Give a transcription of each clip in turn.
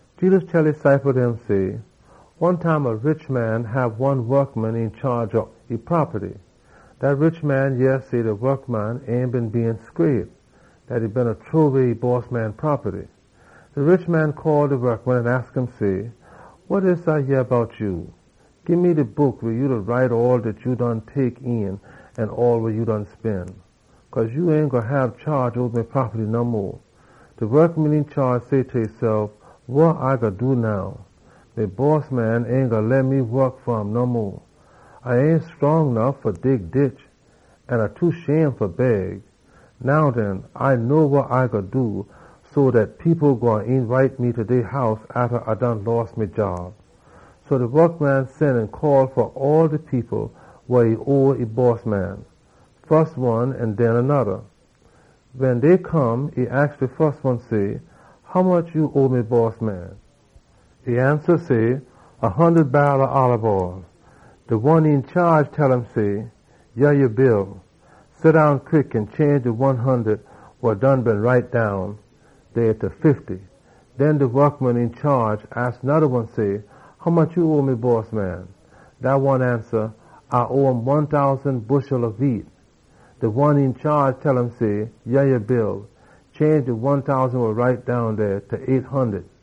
Jedus tell e ciple dem say, “One time a rich man hab one wokman een chaage ob e propaty. Dat rich man yeh say dat de wokman ain been scraight, dat e beena loss e bossman money. De rich man call de wokman an aks um say, ‘Wa dis A yeh bout ya? Gii me de book weh ya da write all dat ya done tek een an all wa ya done spen. Cause ya ain gwine hab chaage oba me propaty no mo.’ De wokman een chaage say ta esef, ‘Wa A gwine do now? Me bossman ain gwine leh me wok fa um no mo. A ain scrong nuff fa dig ditch, an A too shame fa beg. Now den, A know wa A gwine do so dat people gwine eenbite me ta dey house atta A done loss me job.’ So de wokman sen an call fa all de people wa owe e bossman, one atta de oda. Wen dey come, e aks de fus one say, ‘Hommuch ya owe me bossman?’ E ansa say, ‘A hundud barrel ob olib oll.’ De one een chaage tell um say, ‘Yah ya bill. Seddown quick an change de one hundud wa done been write down dey ta fifty.’ Den de wokman een chaage aks noda one say, ‘Hommuch ya owe me bossman?’ Dat one ansa, ‘A owe um one tousan bushel ob wheat.’ De one een chaage tell um say, ‘Yah ya bill. Change de one tousan wa write down dey ta eight hundud.’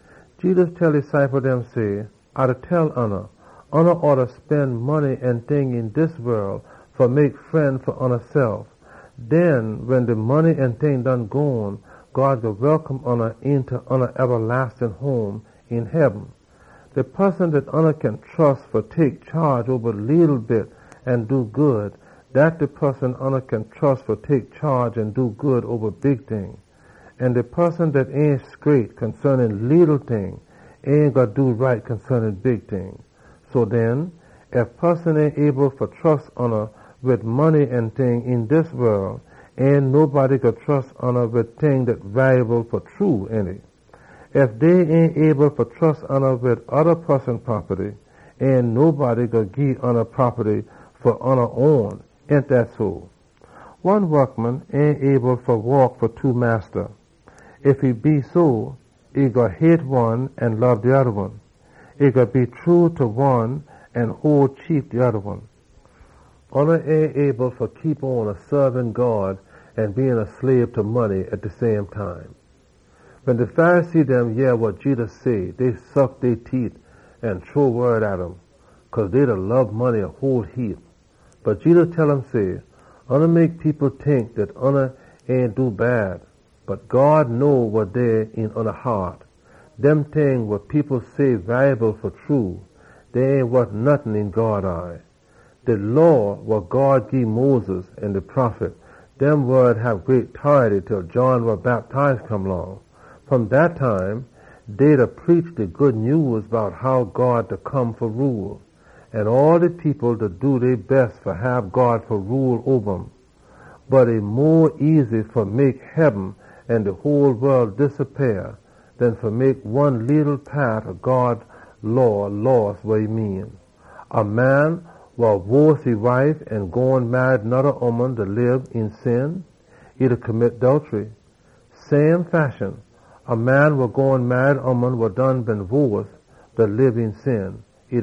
Jedus tell e ciple dem say, “A da tell oona, oona oughta spen money an ting een dis wol fa mek fren fa oonasef. Den wen de money an ting done gone, God gwine welcome oona eenta ya ebalastin home een heaben. De poson dat ya kin trus fa tek chaage oba leetle bit an do good, dat de poson ya kin trus fa tek chaage an do good oba big ting. An de poson dat ain scraight bout leetle ting ain gwine do right wid big ting. So den, ef dey ain able fa trus oona wid money an ting een dis wol, ain nobody gwine trus oona wid ting dat walyable fa true, ainty? Ef dey ain able fa trus oona wid oda poson propaty, ain nobody gwine gii ya propaty fa ya own, ainty dough? “One wokman ain able fa saab two massa. Ef e da try fa do dat, e gwine hate one an lob de oda one. E gwine be true ta one an hole de oda one cheap. Ya ain able fa saab God an be a slabe ta money same time.” Wen de Pharisee dem yeh wa Jedus say, dey suck dey teet an shrow slam pon um, cause dey lob money a whole heap. Bot Jedus tell um say, “Oona mek people tink dat oona ain da do bad. Bot God know wa dey een oona haat. Dem ting wa people say walyable fa true, dey ain wot nottin een God eye. “De Law wa God gii Moses an de prophet dem, dem wod hab heapa tority til John wa Bactize come long. Fom dat time, dey da preach de Good Nyews bout how God da come fa rule, an all de people da do dey bes fa hab God fa rule oba um. Bot e mo easy fa mek heaben an de whole wol disappeah den fa mek one leetle paat ob God Law loss wa e mean. “A man wa worce e wife an gone marry noda ooman da lib een sin. Same fashion, a man wa gone marry ooman wa done been worce da lib een sin.”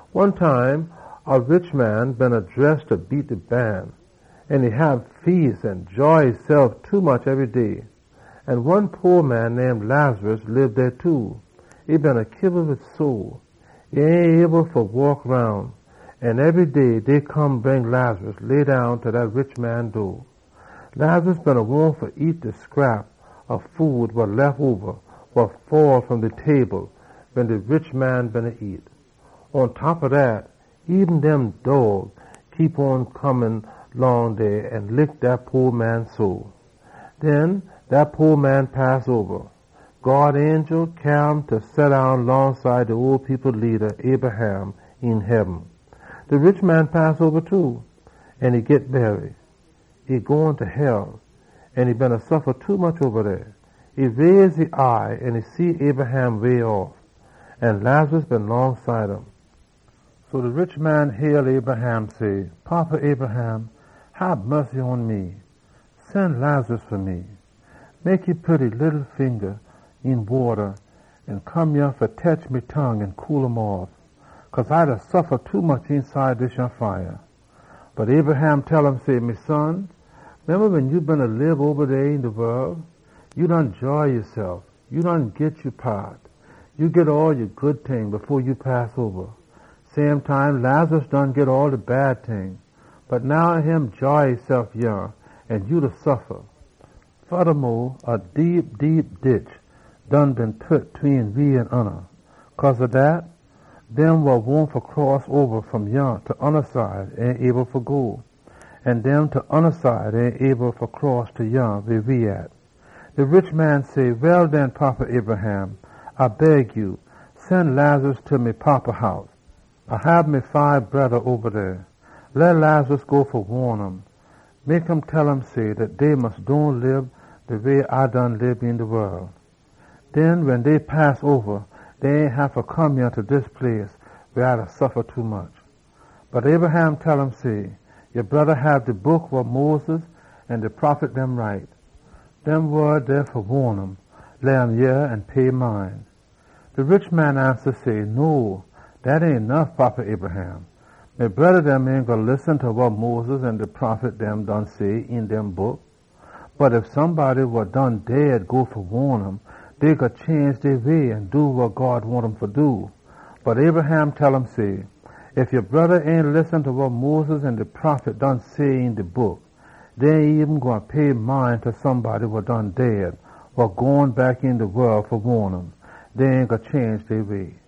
“One time dey been a rich man wa dress fa beat de ban, an e hab feas an joy esef tommuch ebry day. An one po man name Lazarus lib dey too. E been kiba wid sore. E ain able eben fa waak roun. An ebry day, dey come bring Lazarus, leddown ta dat rich man door. Lazarus beena wahn fa nyam de scrap ob food wa lef oba, wa fall fom de table wen de rich man beena nyam. Pontop ob dat, de dog dem beena come long dey an lick dat po man sore. “Den dat po man pass oba. God angel cyaa um fa seddown longside de ole people leada, Abraham, een heaben. De rich man pass oba too, an e git bury. E gone ta hell, an e beena suffa tommuch oba dey. E raise e eye an see Abraham way off, an Lazarus been longside um. So de rich man hail Abraham say, ‘Fada Abraham! Hab mussy pon me! Sen Lazarus fa me. Mek um pit e leetle finga een wata an come yah fa tetch me tongue an cool um off, cause A da suffa tommuch eenside dis yah fire!’ “Bot Abraham tell um say, ‘Me son, memba wen ya beena lib oba dey een de wol, ya beena joy yasef. Ya done git ya paat. Ya git all ya good ting fo ya pass oba. Same time Lazarus done git all de bad ting dem. Bot now e da joy esef yah an ya da suffa. Fodamo, dey a deep deep ditch tween we an oona. Cause ob dat, dem wa wahn fa cross oba fom yah ta oona side ain able fa go, an dem ta oona side ain able fa cross ta yah weh we at.’ “De rich man say, ‘Well den, Fada Abraham, A beg ya, sen Lazarus ta me fada house. A hab me fibe broda oba dey. Leh Lazarus go fa waan um. Leh Lazarus tell um say dat dey mus dohn lib de way A done lib een de wol. Den wen dey pass oba, dey ain haffa come yah ta dis place weh A da suffa tommuch.’ “Bot Abraham tell um say, ‘Ya broda dem hab de Book wa Moses an de prophet dem been write. Dem wod dey fa waan um. Leh um yeh an pay mind.’ “De rich man ansa say, ‘No, dat ain nuff, Fada Abraham. Me broda dem ain gwine listen ta wa Moses an de prophet dem done say een dem Book. Bot ef somebody wa done dead go fa waan um, dey gwine change dey sinful way an do wa God wahn um fa do.’ “Bot Abraham tell um say, ‘Ef ya broda dem ain listen ta wa Moses an de prophet dem done say een de Book, dey ain gwine pay mind ta somebody wa done dead, wa gone back een de wol fa waan um. Dey ain gwine change dey way.’”